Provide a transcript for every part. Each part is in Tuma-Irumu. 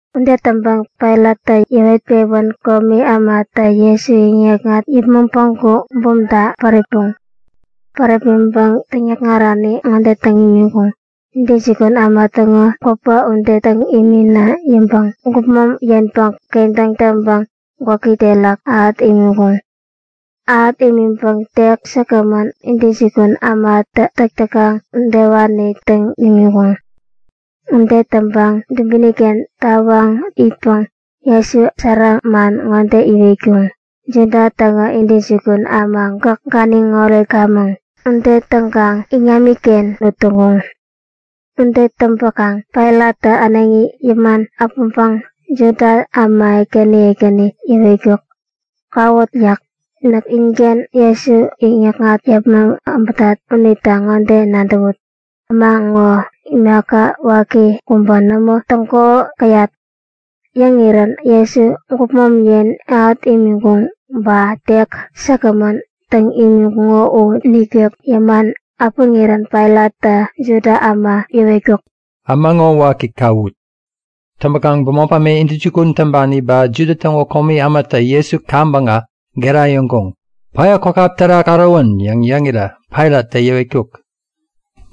Ude täŋpäŋ Pailattä yäwet-pewän komi ämatä Jesu yäŋikŋat yäpmäŋ päŋku bumta päripuŋ. Päripmäŋpäŋ täŋikŋarani ŋode täŋ imiŋkuŋ; Intäjukun äma täŋo gwäpä ude täŋ imina yäŋpäŋ gupmom yenpäŋ kedoŋ täŋpäŋ gwäki terak ähät imiŋkuŋ. Ähät imiŋpäŋ tek säkgämän, intäjukun ämatä täk täkaŋ udewani täŋ imiŋkuŋ. Ude täŋpäŋ dubini-ken tawaŋ itpäŋ Jesu sära man ŋode iwetkuŋ; Juda täŋo intäjukun äma gäk ganiŋ oretkamäŋ! Ude täŋkaŋ iŋami-kengän ut täŋkuŋ. Ude täŋpäkaŋ Pailattä äneŋi yäman äpäŋpäŋ Juda äma ekäni ekäni yäwetkuk; Kawut yäk. Näk inken Jesu yäŋikŋat yäpmäŋ äbätat unita ŋode nadäwut; Äma ŋo imaka waki kubä nämo täŋkuko käyat. Yäŋirän Jesu gupmom yen ähät imiŋkuŋo ba tek säkgämän täŋ imiŋkuŋo u nikek yäman äpäŋirän Pailattä Juda äma yäwetkuk; Äma ŋo waki kawut! Täŋpäkaŋ bämop äma intäjukun täŋpani ba Juda täŋo komi ämatä Jesu kaŋpäŋä gera yäŋkuŋ; Päya kwakäp terak ärowän! yäŋ yäŋirä Pailattä yäwetkuk;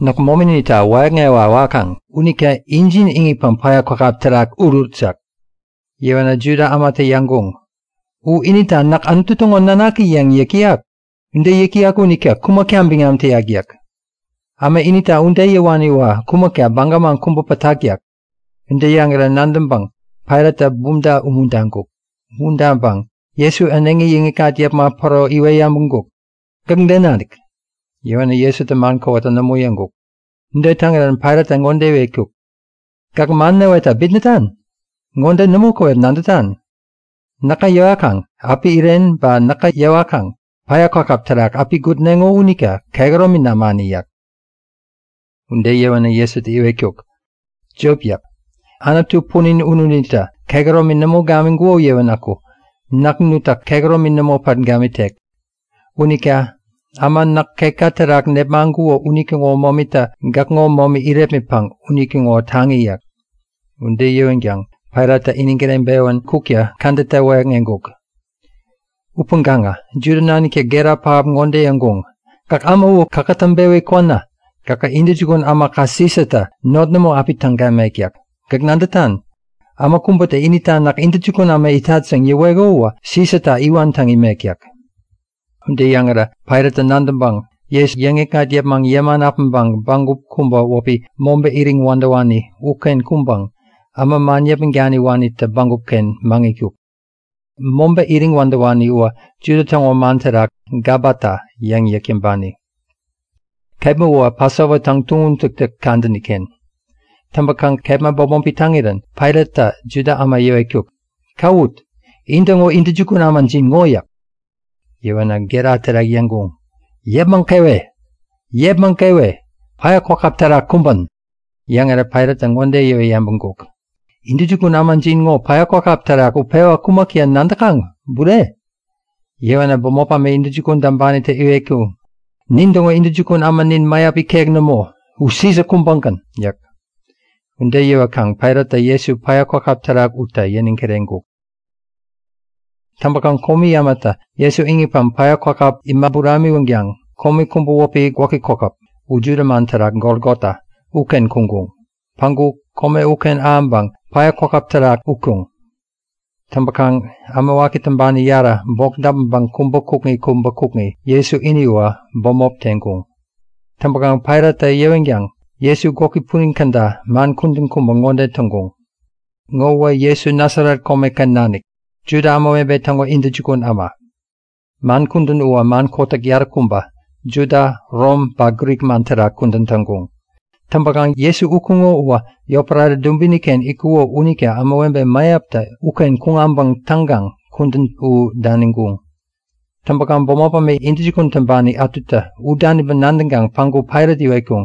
Näk mominita wäyäkŋewa wakaŋ unita injin iŋitpäŋ päya kwakäp terak urut yäk. Yäwänä Juda ämatä yäŋkuŋ; U inita näk Anutu täŋo nanaki yäŋ yäk täyak. Ude yäk täyak unita kumäkta biŋam täyak yäk. Äma inita ude yäwani uwä kumäkta baga man kubä pätak yäk. Ude yäŋirä nadäŋpäŋ Pailattä bumta umuntaŋkuk. Umuntaŋpäŋ Jesu äneŋi yäŋikŋat yäpmäŋ päro iwet yabäŋkuk; Gäk de nanik? Yäwänä Jesutä man kowata nämo yäŋkuk. Ude täŋirän Pailattä ŋode iwetkuk; Gäk man näwetta bitnätan? Ŋode nämo käwep nadätan; Näkä yäwakaŋ api iren ba näkä yäwakaŋä päya kwakäp terak api gutneŋo unita kehäromi namani yäk. Ude yäwänä Jesutä iwetkuk; Jop yäk. Anutu punin ununitä kehäromi nämo gamiŋkuko yäwänäku näk nutta kehäromi nämo pat gamitek. Unita äma näk ketka terak nepmaŋkuko unitäŋo momitä gäkŋo momi irepmitpäŋ unitäŋo taŋi-inik yäk. Ude yäwänkaŋ Pailattä iniŋ kireŋpewän kukta kädetta wäyäkŋeŋkuk. Upäŋkaŋä Juda naniktä gera pähap ŋode yäŋkuŋ; Gäkä äma u kakätäŋ-pewi kwänä gähä intäjukun ämaka Sisatä not nämo api täŋ gamek yäk. Gäk nadätan? Äma kubätä inita näk intäjukun äma itat yäŋ yäweko uwä Sisata iwan täŋ imek yäk. Ude yäŋirä Pailattä nadäŋpäŋ Jesu yäŋikŋat yäpmäŋ yäman äpäŋpäŋ bägup kubä wäpi Mobä Iriŋ Wädäwani uken kuŋpäŋ äma man yäpmäŋ daniwanitä bägup-ken maŋitkuk. (Mobä Iriŋ Wädäwani uwä Juda täŋo man terak Gabata yäŋ yäk täŋpani.) Kepma uwä Pasova täŋtuŋum täktäk kadäni-ken. Täŋpäkaŋ kepma bämopi täŋirän Pailattä Juda äma yäwetkuk; Kawut! In-täŋo intäjukun ämajin ŋo yäk. Yäwänä gera terak yäŋkuŋ; Yäpmäŋ kewe! Yäpmäŋ kewe! Päya kwakäp terak kumbän! Yäŋirä Pailattä ŋode yäwet yabäŋkuk; Intäjukun ämajin ŋo päya kwakäp terak utpewa kumäkta nadäkaŋ, bure? Yäwänä bämop äma intäjukun täŋpanitä iwetkuŋ; Nintäŋo intäjukun ämanin mäyap ikek nämo. U Sisa kubägän! yäk. Ude yäwäkaŋ Pailattä Jesu päya kwakäp terak utta yäniŋ kireŋkuk. Täŋpäkaŋ komi ämatä Jesu iŋitpäŋ päya kwakäp imä buramiwänkaŋ kome kubä wäpi Gwäki Kokäp (u Juda man terak Golgota) uken kuŋkuŋ. Päŋku kome uken ahäŋpäŋ päya kwakäp terak utkuŋ. Täŋpäkaŋ äma waki täŋpani yarä, bok däpmäŋpäŋ kubä kukŋi kubä kukŋi, Jesu ini uwä bämop teŋkuŋ. Täŋpäkaŋ Pailattä yäwänkaŋ Jesu gwäki punin käda man kudän kubä ŋode täŋkuŋ; Ŋowä Jesu Nasaret Komeken Nanik, Juda Ämawebe Täŋo Intäjukun Äma. Man kudän uwä man kotäk yaräkubä, Juda, Rom ba Grik man terak kudän täŋkuŋ. Täŋpäŋ kome Jesu utkuŋo uwä yotpärare dubini-ken itkuko unita ämawebe mäyaptä uken kuŋ äbäŋ täŋkaŋ kudän u daniŋkuŋ. Täŋpäkaŋ bämop äma intäjukun täŋpani ätutä u daniŋpäŋ nadäŋkaŋ päŋku Pailat iwetkuŋ;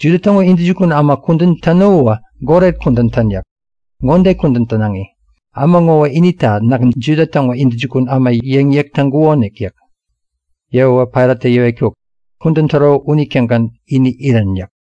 Juda täŋo intäjukun äma kudän täno uwä goret kudän tän yäk. Ŋode kudän tänaŋi; Äma ŋowä inita Näk Juda täŋo intäjukun äma yäŋ yäk täŋkukonik yäk. Yäwäwä Pailattä yäwetkuk; Kudän täro unitägän ini irän yäk.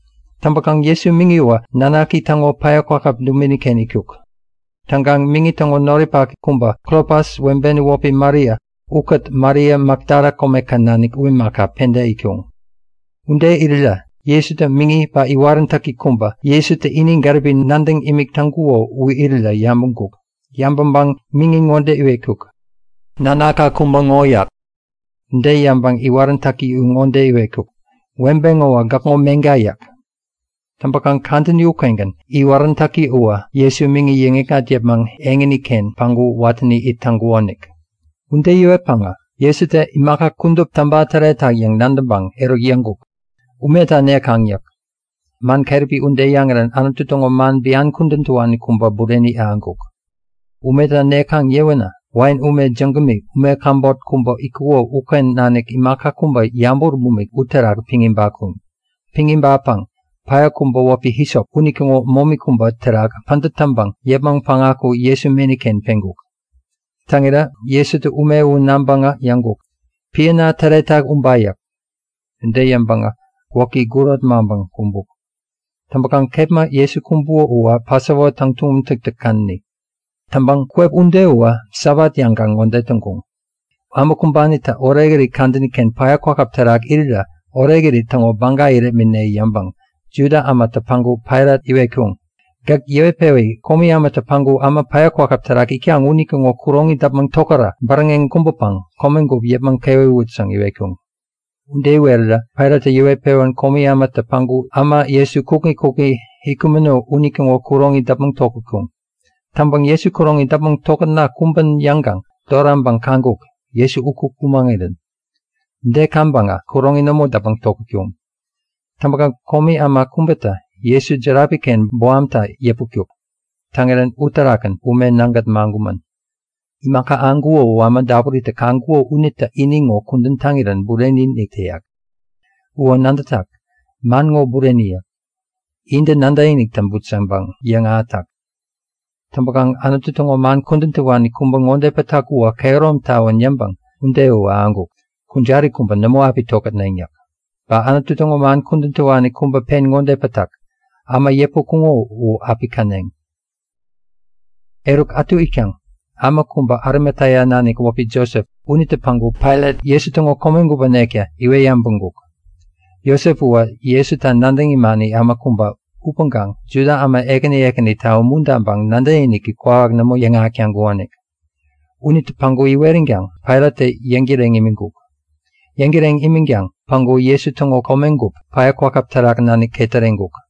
Täŋpäkaŋ Jesu miŋi uwä nanaki täŋo päya kwakäp dubini-ken itkuk. Täŋkaŋ miŋi täŋo noripaki kubä, Klopas webeni wäpi Maria ukät Maria Makdala komeken nanik u imaka, penta itkuŋ. Ude irirä Jesutä miŋi ba iwaräntäki kubä, Jesutä ini gäripi-inik nadäŋ imik täŋkuko u irirä yabäŋkuk. Yabäŋpäŋ miŋi ŋode iwetkuk; Nanakka kubä ŋo yäk. Ude yäŋpäŋ iwaräntäki u ŋode iwetkuk; Webe ŋowä gäkŋo meŋka yäk. Täŋpäkaŋ kadäni ukengän iwaräntäki uwä Jesu miŋi yäŋikŋat yäpmäŋ eŋini-ken päŋku watäni it täŋkukonik. Ude yäwetpäŋä Jesutä Imaka kudup täŋpa täretak yäŋ nadäŋpäŋ, eruk yäŋkuk; Umeta nekaŋ yäk. Man keräpi ude yäŋirän Anutu täŋo man bian kudän täwani kubä bureni ahäŋkuk. Umeta nekaŋ yäwänä wain ume jägämi, ume käbot kubä itkuko uken nanik imaka kubä yabut bumik uterak piŋ ibatkuŋ. Piŋ ibatpäŋ päya kubä wäpi hisop unitäŋo momi kubä terak pädät täŋpäŋ yäpmäŋ päŋaku Jesu meni-ken peŋkuŋ. Täŋirä Jesutä ume u naŋpäŋä yäŋkuk; Piäna täretak uba yäk. Ude yäŋpäŋä gwäki gurot maŋpäŋ kumbuk. Täŋpäkaŋ kepma Jesu kumbuko uwä Pasova täŋtuŋum täktäk kadäni. Täŋpäŋ kwep ude uwä Sabat yäŋkaŋ ŋode täŋkuŋ; Äma kumbanitä orekirit kadäni-ken päya kwakäp terak irirä orekirit täŋo baga irepmitne yäŋpäŋ Juda ämatä päŋku Pailat iwetkuŋ; Gäk yäwetpewi komi ämatä päŋku äma päya kwakäp terak itkaŋ unitäŋo kuroŋi däpmäŋ tokärä bäräŋeŋ kumbäkaŋ komegup yäpmäŋ kewewut yäŋ iwetkuŋ. Ude iwerirä Pailattä yäwet-pewän komi ämatä päŋku äma Jesu kukŋi kukŋi itkumäno unitäŋo kuroŋi däpmäŋ tokätkuŋ. Täŋpäŋ Jesu kuroŋi däpmäŋ tokätna kumbän yäŋkaŋ doraŋpäŋ kaŋkuŋ; Jesu uku kumäŋirän. Ude kaŋpäŋä kuroŋi nämo däpmäŋ tokätkuŋ. Täŋpäkaŋ komi äma kubätä Jesu järapi-ken bohamtä yäputkuk. Täŋirän uterakgän ume nägät maŋkumän. (Imaka ahäŋkuko u äma dapuritä kaŋkuko unitä ini ŋo kudän täŋirän bureni-inik täyak. Uwä nadätak; Man ŋo bureni yäk. Intä nadäkinik täŋput yäŋpäŋ yäŋahätak.) Täŋpäkaŋ Anutu täŋo man kudän täwani kubä ŋode pätak uwä kehärom tawän yäŋpäŋ ude u ahäŋkuk; Kujari kubä nämo api tokätneŋ yäk. Ba Anutu täŋo man kudän täwani kubä pen ŋode pätak; Äma yäputkuŋo u api käneŋ. Eruk ätu itkaŋ äma kubä Arimatea nanik wäpi Josep unitä päŋku Pailat Jesu täŋo komegup änekta iwet yabäŋkuk. (Josep uwä Jesuta nadäŋ imani äma kubä upäŋkaŋ Juda äma ekäni ekänita umuntaŋpäŋ nadäkiniki kwawak nämo yäŋahäk täŋkukonik.) Unitä päŋku iweränkaŋ Pailattä yäŋtäreŋ imiŋkuk. Yäŋtäreŋ imänkaŋ päŋku Jesu täŋo komegup päya kwakäp terak nanik ketäreŋkuk.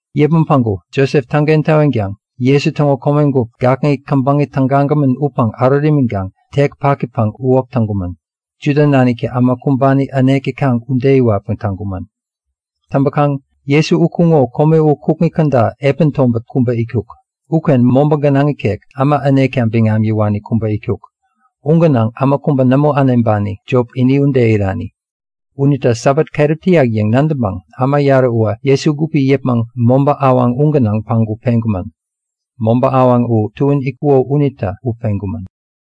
Yäpmäŋ päŋku Josep täŋken täwänkaŋ Jesu täŋo komegup gakŋi käbäŋi tägagämän upäŋ ärut imiŋkaŋ tek pakipäŋ uwäk täŋkumän. Juda naniktä äma kumbani änek täkaŋ ude iwatpäŋ täŋkumän. Täŋpäkaŋ Jesu utkuŋo kome u kukŋi käda epän tobät kubä itkuk. Uken mobä gänaŋ ikek, äma änekta biŋam yäwani kubä itkuk. U gänaŋ äma kubä nämo äneŋpani, jop ini ude irani. Unita Sabat keräp täyak yäŋ nadäŋpäŋ äma yarä uwä Jesu gupi yäpmäŋ mobä awaŋ u gänaŋ päŋku peŋkumän. Mobä awaŋ u tuän itkuko unita u peŋkumän.